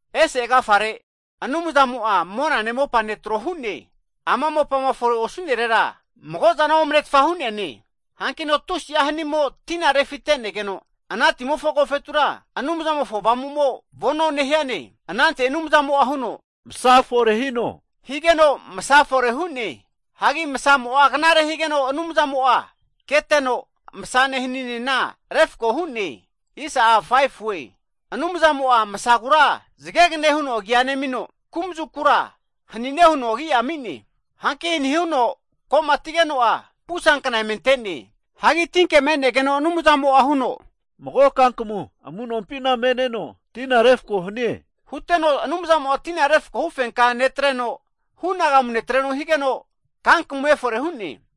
Ese agafare Anumzamo'a monane mopane trohu'ne. Ama mopama fore osu'nerera, mago zana omnetfa hu'neane. Hankino tusi'a hanimo tina refite'negeno, ana timofo agofetura Anumzamofo Avamumo vono nehiane. Anante Anumzamo'a huno, Masa fore hino! higeno masa fore hu'ne. Hagi masamo'a knare higeno Anumzamo'a keteno, masane haninena refko hu'ne. Anumzamo'a masagura zagegane huno agi'a nemino, kumazukura hanine huno agi'a ami'ne. Hanki hani huno ko'matigeno'a, pusankna emente'ne. Hagi tinke me'negeno Anumzamo'a huno, Mago kankamu amu'nompina me'neno tina refko hanie. Huteno Anumzamo'a tina refkohu fenka netreno, hunagamu atregeno, kankamu efore hu'ne.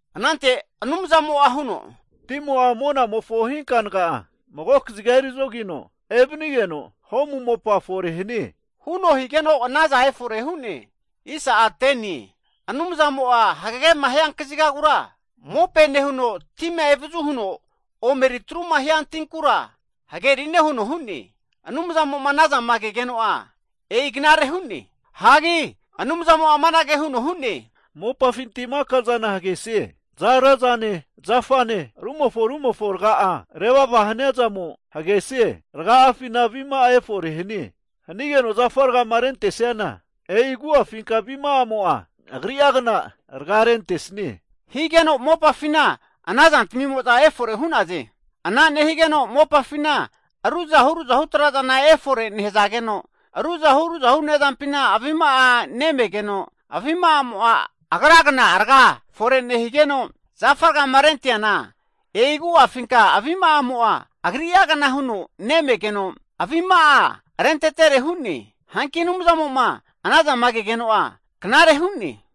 Anante Anumzamo'a huno, Timo'a monamofo hinkanaga mago kaziga eri zogino evanigeno, ho'mu mopa fore hanie, huno higeno anaza efore hu'ne. Anumzamo'a hagagema hiankazigagura mope nehuno, tima evazu huno omeri atruma hiantinkura, hagerine huno hu'ne. Anumzamo'ma anazama kegeno'a, e'i knare hu'ne. Hagi Anumzamo'a amanage huno hu'ne, Mopafinti maka'za hagesie. Za'ara zane zafane rumofo rumofo raga'a revava hanaza zantamimo'za hagesaze. Ragazmifina avima'a efore hanie! Hanige'za zafa rgama rentesazana e'i zamagu'afinka avima'amo'za zamagri'agna raga rentesaze. Hige'za mopafina ana zantamimo'za efore hu'naze. Ana nehazage'za mopafina ruzahu ruzahu trazana erifore nehazageno, ruzahu ruzahu ne'zampina avima'a me'nea rentageno, avima'amo'a agragna raga fore nehigeno, zafa rgama renteana e'i agu'afinka avima'amo'za zamagri'agna huno nemegeno, avima'a rentetere hu'ne. Hanki Anumzamo'ma anazantamima kegeno'a knare hu'ne.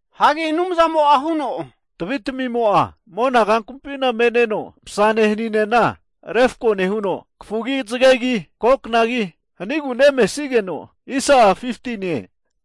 Hagi Anumzamo'a huno, Tavitamimo'za mona kankamumpi me'neza, masane haninena refko nehu'za, kafugi, zagegi, ko knagi hanagu nemesageno, ana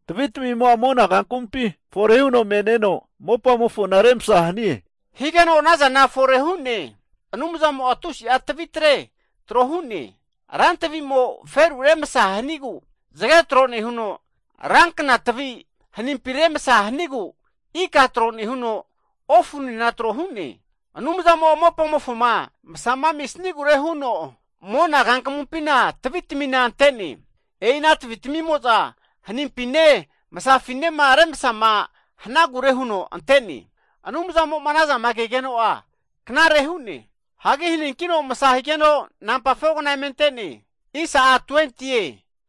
tavitamimo'za mona kankamumpi efore hu'za me'neza mopamofona remasa hanaze, hige'za ana zantamina fore hu'naze. Anumzamo'a tusi'a tavi tre tro hu'ne. Rantavimo feru remasa hanigu zage tro nehuno, rankna tavi hanimpi remasa hanigu, ika tro nehuno, ofuntaminena tro hu'ne. Anumzamo'a mopamofoma masama amisanagure huno mona kankamumpina tavitamina zamante'ne. E'i ana tavi'mo'za hanimpine masafinema remasama hanagure huno zamante'ne. Anumzamo'ma anazantamima kegeno'a knare hu'ne. Hagi haninkino masa higeno, nampa 4kna emente'ne.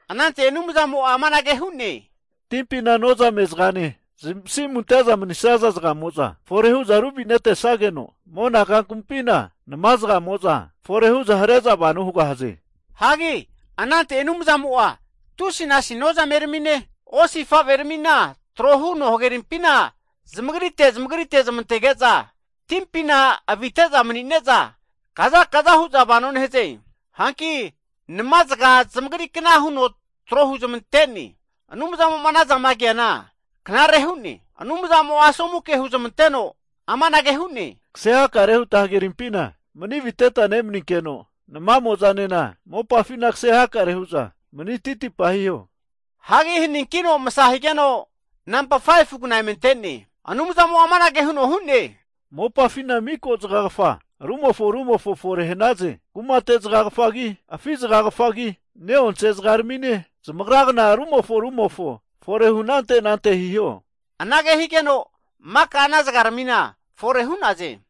Anante Anumzamo'a amanage hu'ne, Timpina nozame zagane, zamasimu ante'za manisaza zagamo'za efore hu'za ruvinetesageno, mona kankamumpina namazagamo'za efore hu'za hare'za vano hugahaze. Hagi anante Anumzamo'a tusinasi nozameramine, osifaveramina trohuno hagerimpina zamagrite zamagrite zamantege'za timpina avite'za mani'neza kaza kaza hu'za vano nehaze. Hanki namazaga zamagri kna huno tro huzmante'ne. Anumzamo'ma anazama keana knare hu'ne. Anumzamo'a asomu ke hunezmanteno amanage hu'ne, kase hakare huta hagerimpina mani aviteta nemaninkeno, namamo'zanena mopafina kase hakare hu'za mani titipa hiho. Hagi haninkino masa higeno, nampa 5fu kna emente'ne. Anumzamo'a amanage huno hu'ne, Mopafina miko zagagafa rumofo rumofo fore hanaze. Kumate zagagafagi, afi zagagafagi, ne'onse zagaramine, zamagragna rumofo rumofo fore hu anante anante hiho. Anage higeno maka ana zagaramina fore hu'naze.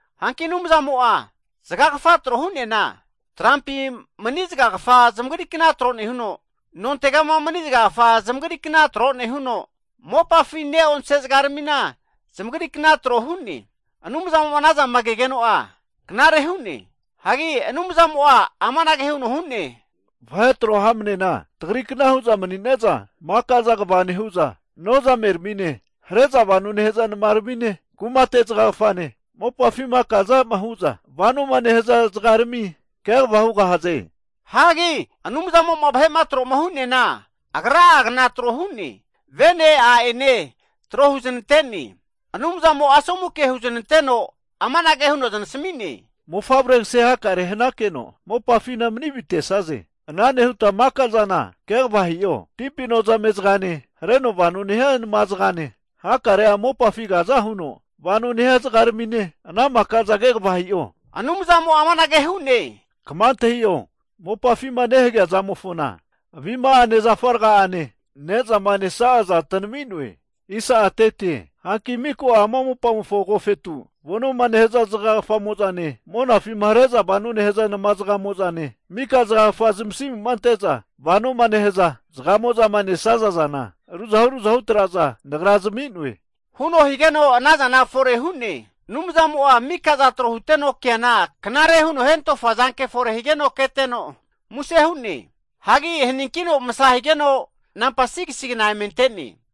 Hanki Anumzamo'a zagagafa tro hu'neana, trampi mani zagagafa zamagri kna tro nehuno, nontegama mani zagagafa zamagri kna tro nehuno, mopafi ne'onse zagaramina zamagri kna tro hu'ne. Anumzamo'ma anazama kegeno'a knare hu'ne. Hagi Anumzamo'a amanage huno hu'ne, Vahe tro hamnena tagrikna hu'za manine'za, maka'za kva nehu'za nozameramine, hare'za vano nehaza namaramine, kumate zagagafane, mopafima kazama hu'za vanoma nehaza zagarami kegava hugahaze. Hagi Anumzamo'ma vahe'ma tro hu'neana, Agra'agna tro hu'ne. Vene a'ene tro huzanante'ne. Anumzamo'a asomu ke huneznanteno amanage huno zanasmi'ne, Mofavre kase hakare hanakeno, mopafina mani vitesaze. Ana nehuta mikoza kegava hi'o. Timpi nozame zagane, hareno vano nehia nama zagane, hakare'a mopafi kaza huno vano nehia zagaramine ana makaza kegava hi'o. Anumzamo'a amanage hu'ne, Kma antahi'o! Mopafima nehagea zamofona avima'ane zafa raga'ane nezama nesa'aza tanami'noe. Hanki mika ama mopamofo agofetu vonoma nehaza zagagafamo'zane, monafima hare'za vonoma nehaza nama'zaga'mozane, mika zagagafama zamasimuma ante'za vanoma nehaza zagamo'zama nesaza zana, ruzahu ruzahu traza Nagra zami'noe, huno higeno ana zana fore hu'ne. Anumzamo'a mika'za trohuteno keana knare huno hentofa zanke fore higeno keteno, muse hu'ne. Hagi haninkino masa higeno, nampa 6si kna emente'ne.